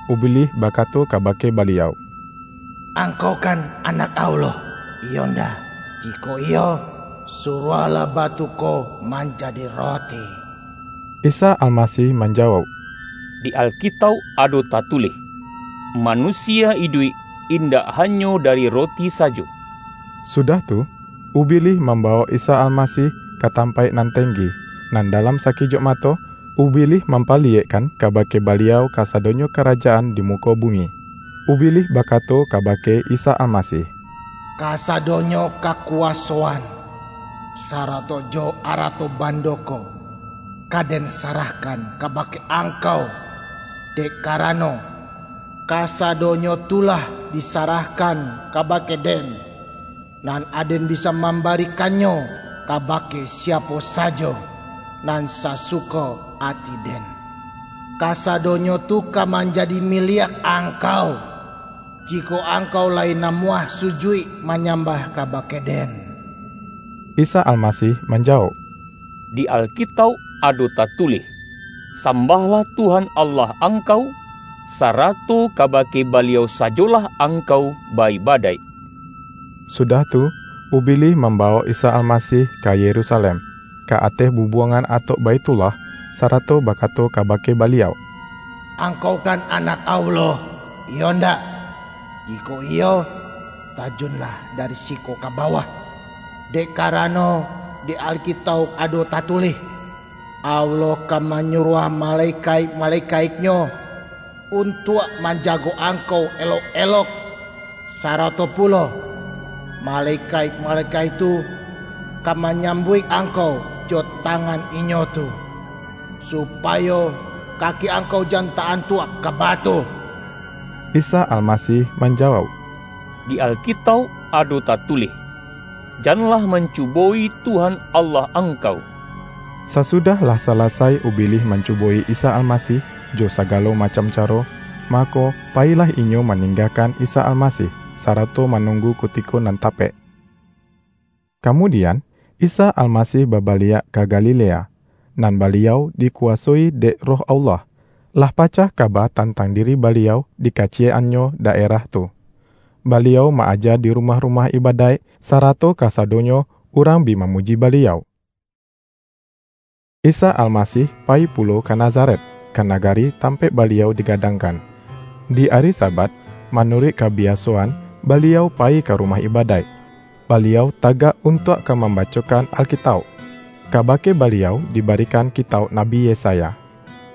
Ubilih bakato kabake Baliau,”Angkau kan Anak Allah, iyo ndak? Jikok iyo, suruahlah batu ko manja-di roti.” Isa Almasih manjawauk,”Di Alkitauk ado tatulih, ’ Manusia iduik, indak hanyo dari roti sajo.’” Sudah tu, Ubilih mambawok Isa Almasih ka tampaik nan tenggi, nan dalam sakijok mato, Ubilih mampali-yekkan kabake Baliau kasadonyo ka-rajaan di muko bumi. Ubilih bakato kabake Isa Almasih,”Kasadonyo ka-kuwasoan, sarato jo arato bando ko, ka den sarahkan kabake Angkau dek karano, kasadonyo tu lah disarahkan kabake den, nan aden bisa mambarikannyo kabake siapo sajo, nan sasuko ati den. Kasadonyo tu ka manjadi mi-liak Angkau, jikok Angkau lai namuah sujuik manyambah kabake den.” Isa Almasih manjawauk,”Di Alkitauk ado tatulih, ’Sambahlah Tuhan Allah angkau, sarato kabake Baliau sajolah angkau ba-ibadaik.’” Sudah tu, Ubilih mambawok Isa Alma-sih ka Yerusalem, ka ateh bubuangan atok Baithullah, sarato bakato kabake Baliau,”Angkau kan Anak Allah, iyo ndak? Jikok iyo, tajunlah dari siko ka bawah. Dek karano, di Alkitauk ado tatulih, ’Allah ka manyuruah malekaik-malekaik-Nyo un-tuak manjago Angkau elok-elok.’ Sarato pulo, ’ Malekaik-malekaik tu ka manyam buik Angkau jo tangan inyo tu, supayo ka-ki Angkau jan ta-antuak ka batu.’” Isa Almasih manjawauk,”Di Alkitauk ado tatulih, ’Janlah mancu-bo-i Tuhan, Allah angkau.’” Sasudah lah salasai Ubilih mancubo-i Isa Almasih, jo sagalo macam caro, mako, payilah inyo maninggakan Isa Almasih, sarato manunggu kutiko nan tapek. Kamudian, Isa Almasih babaliak ka Galilea; nan Baliau dikuwasoi dek Roh Allah. Lah pacah kaba tantang diri Baliau di kaciyek-annyo daerah tu. Baliau ma-aja di rumah-rumah ibadaik, sarato kasa-donyo urang bi mamuji Baliau. Isa Almasih payi pulo ka Naza-ret, ka nagari tampaik Baliau diga-dangkan. Di ari Sabat, manuruik kabi-asoan, Baliau payi ka rumah ibadaik. Baliau tagak untuak ka mambacokan Alkitauk, kabake Baliau dibarikan kitauk Nabi Yesaya.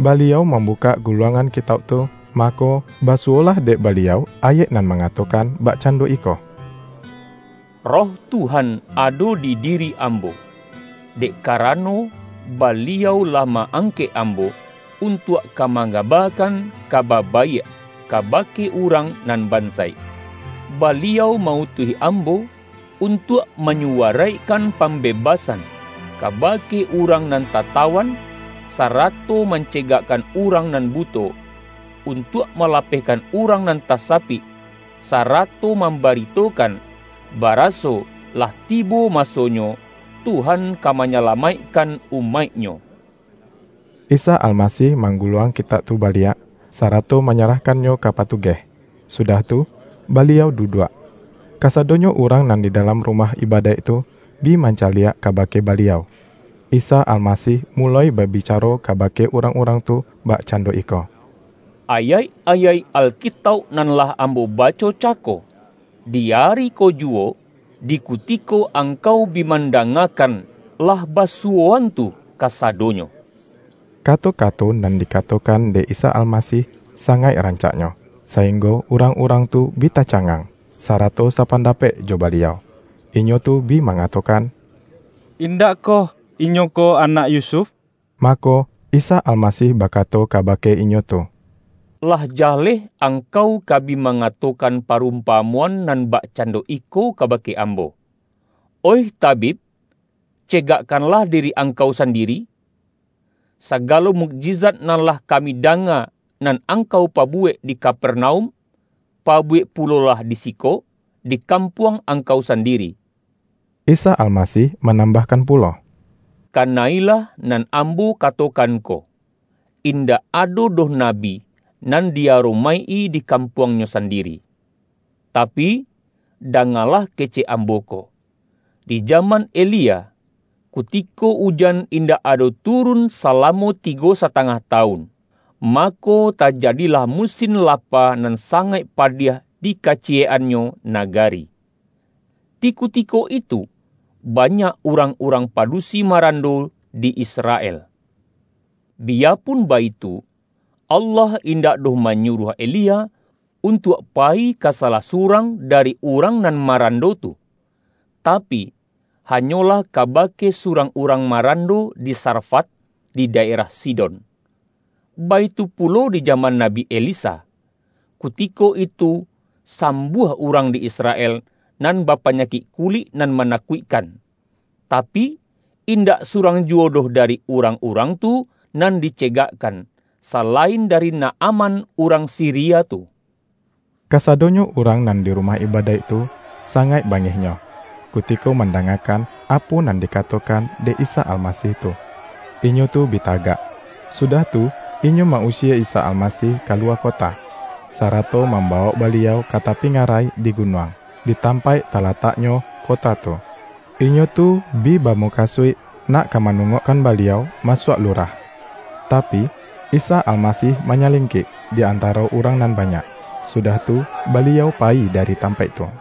Baliau mambu-kak guluangan kitauk tu, mako, basuwolah dek Baliau ayaik nan manga-tokan bakcando iko, ”Roh Tuhan ado di diri Ambo, dek karano Baliau lah ma-angkek Ambo, untuak ka mangabakan Kaba Baiak, kabake urang nan bansaik. Baliau ma-utuih Ambo, untuak manyuwaraikkan pambebasan, kabake urang nan tatawan, sarato mancegakkan urang nan buto; untuak malapehkan urang nan tasapik, sarato mambaritokan, baraso lah tibo masonyo, Tuhan ka manyalamaikkan umaik-Nyo.” Isa Almasih mangguluang kitauk tu baliak, sarato manyarahkannyo ka patugeh, sudah tu, Baliau duduak. Kasadonyo urang nan di dalam ru-mah ibadaik tu, bi mancaliak kabake Baliau. Isa Almasih muloi babicaro kabake urang-urang tu, bakcando iko,”Ayaik-ayaik Alkitauk nan lah Ambo baco cako, di ari ko juwo, di kutiko angkau bi mandangakan, lah basuwo-an tu kasadonyo.” Kato-kato nan dikatokan dek Isa Almasih sangaik rancaknyo, sainggo urang-urang tu bi tacangang, sarato sapandapek jo Baliau. Inyo tu bi ma-ngatokan,”Indak koh Inyo ko anak Yusuf?” Mako, Isa Almasih bakato kaba-ke inyo tu,”Lah jaleh angkau ka bi mangatokan parumpamoan nan bak-cando iko kabake Ambo, ’Oih tabib, cegakkanlah diri Angkau sandiri. Sa-galo mukjizat nan lah kami danga, nan Angkau pabuwek di Kapernaum, pa-buwek pulolah di siko, di kampuang Angkau sandiri.’” Isa Almasih ma-nambahkan pulo,”Kana-ilah nan Am-bo katokan ko, indak ado doh nabi nan di-aromaik-i di kampuangnyo sandi-ri. Tapi, dangalah kecek Ambo ko: di jaman Elia, kutiko ujan indak ado turun, salamo tigo satangah tawun, mako, tajadilah musim lapa nan sa-ngaik padiah di kaciyek-annyo naga-ri. Di kutiko itu, banyak urang-urang padusi marando di Israel. Biyapun baitu, Allah indak doh manyuruah Elia, untuak payi ka salah surang, da-ri urang nan marando tu, tapi, hanyo-lah kabake surang urang marando di Sarfat, di daerah Sidon. Baitu pulo di jaman Nabi Elisa, kutiko itu sam-buah urang di Israel, nan bapanyakik kulik nan manakuikkan, tapi, indak surang juwo doh dari urang-urang tu nan dicegakkan, salain dari Naaman urang Siria tu.” Kasadonyo urang nan di rumah ibadaik tu, sangaik bangihnyo, kuti-ko mandangakan apo nan dikatokan dek Isa Almasih tu. Inyo tu bi ta-gak, sudah tu inyo ma-usie Isa Almasih kaluwa kota, sarato mambawok Baliau ka tapi ngarai di gunuang, di tampaik talataknyo kota tu. Inyo tu bi bamu-kasuik, nak ka manungokkan Baliau masuak lurah. Tapi, Isa Almasih manyalingkik di antaro urang nan ba-nyak, sudah tu Baliau payi dari tam-paik tu.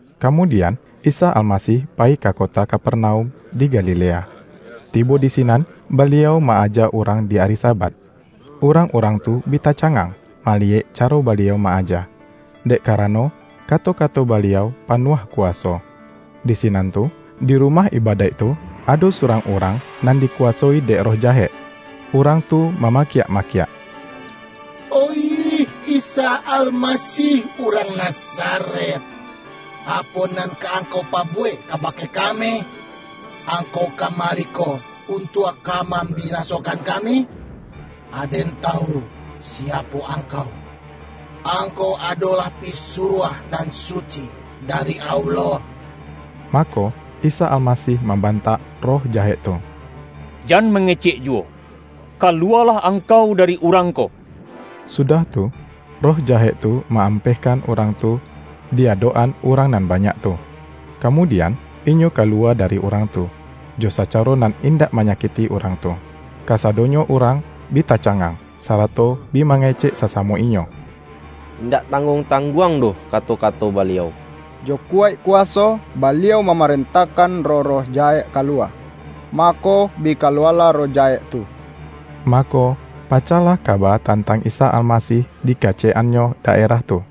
Kamudian, Isa Almasih payi ka kota Kapernaum di Galilea. Tibo di sinan, Baliau ma-aja urang di ari Sa-bat. Urang-urang tu bi tacangang, maliyek caro Baliau ma-aja, dek ka-rano kato-kato Baliau panuah kuwa-so. Di sinan tu, di rumah ibadaik tu, ado surang urang nan dikuwasoi dek roh jahek. Urang tu mamakiak-makiak, ”Oih Isa Almasih, urang Nazaret, apo nan ka Angkau pabuwek kabake kami? Angkau kamari ko un-tuak ka mambinasokan kami? Aden tawu siapo Angkau: Angkau adolah Pisuruah Nan Suci dari Allah!” Mako, Isa Almasih mambantak roh jahek tu,”Jaan mangecek juwo! Kaluwalah angkau dari urang ko!” Su-dah tu, roh jahek tu ma-ampehkan urang tu, di adok-an urang nan ba-nyak tu, kamudian, inyo kaluwa da-ri urang tu, jo sacaro nan indak ma-nyakikti urang tu. Kasadonyo urang bi tacangang, sarato bi mangecek sasamo inyo,”Indak tangguang-tangguang doh kato-kato Baliau. Jo kuwaik kuwaso, Baliau mamarentahkan roh-roh jahek kaluwa, mako, bi kaluwalah roh ja-hek tu!” Mako, pacahlah kaba tan-tang Isa Almasih di kaciyek-annyo da-erah tu.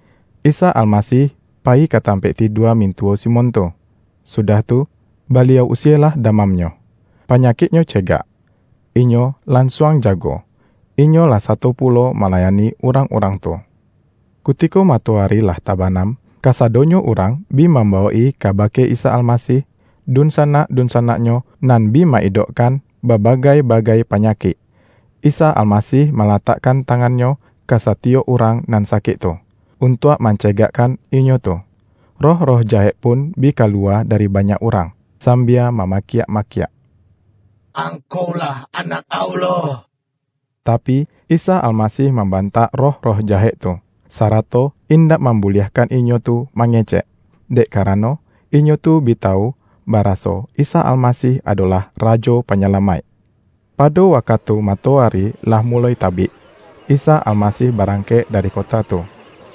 Isa Almasih payi ka tampaik tidua mintuwo Simon tu, sudah tu, Baliau usielah damamnyo. Panyakiknyo cegak, inyo lansuang ja-go, inyo lah sato pulo malayani urang-urang tu. Kutiko matoari lah tabanam, ka-sadonyo urang bi mambawok-i kaba-ke Isa Almasih, dunsanak-dunsanak-nyo nan bi ma-idokkan babagai-bagai panyakik. Isa Almasih malatakkan tangan-Nyo ka satiyok urang nan sa-kik tu, untuak mancegakkan inyo tu. Roh-roh jahek pun bi kaluwa dari banyak urang, sambia mamakiak-ma-kiak,”Angkau-lah Anak Allah!” Tapi, Isa Almasih mambantak roh-roh jahek tu, sarato indak mambuliah-kan inyo tu mangecek, dek karano, inyo tu bi tawu, baraso Isa Almasih adolah Rajo Panyalamaik. Pado wakatu matoari lah muloi ta-bik, Isa Almasih barangkek dari kota tu,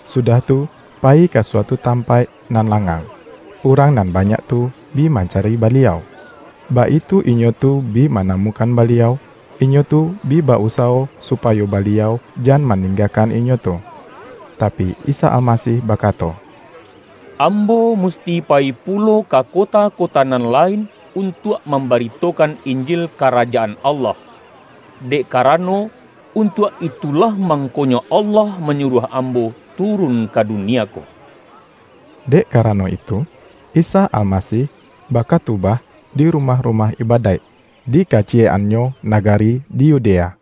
sudah tu payi ka suatu tampaik nan la-ngang. Urang nan banyak tu bi mancari Baliau, baitu inyo tu bi manamukan Ba-liau, inyo tu bi ba-usawo supayo Baliau jan maninggakan inyo tu. Tapi, Isa Almasih bakato,”Ambo musti payi pulo ka kota-kota nan lain, untuak mamba-ritokan Injil Karajaan Allah, dek kara-no, untuak itulah mangkonyo Allah ma-nyuruah Ambo turun ka dunia ko.” Dek karano itu, Isa Almasih ba-katubah di rumah-rumah ibadaik, di kaciyek-annyo nagari di Yudea.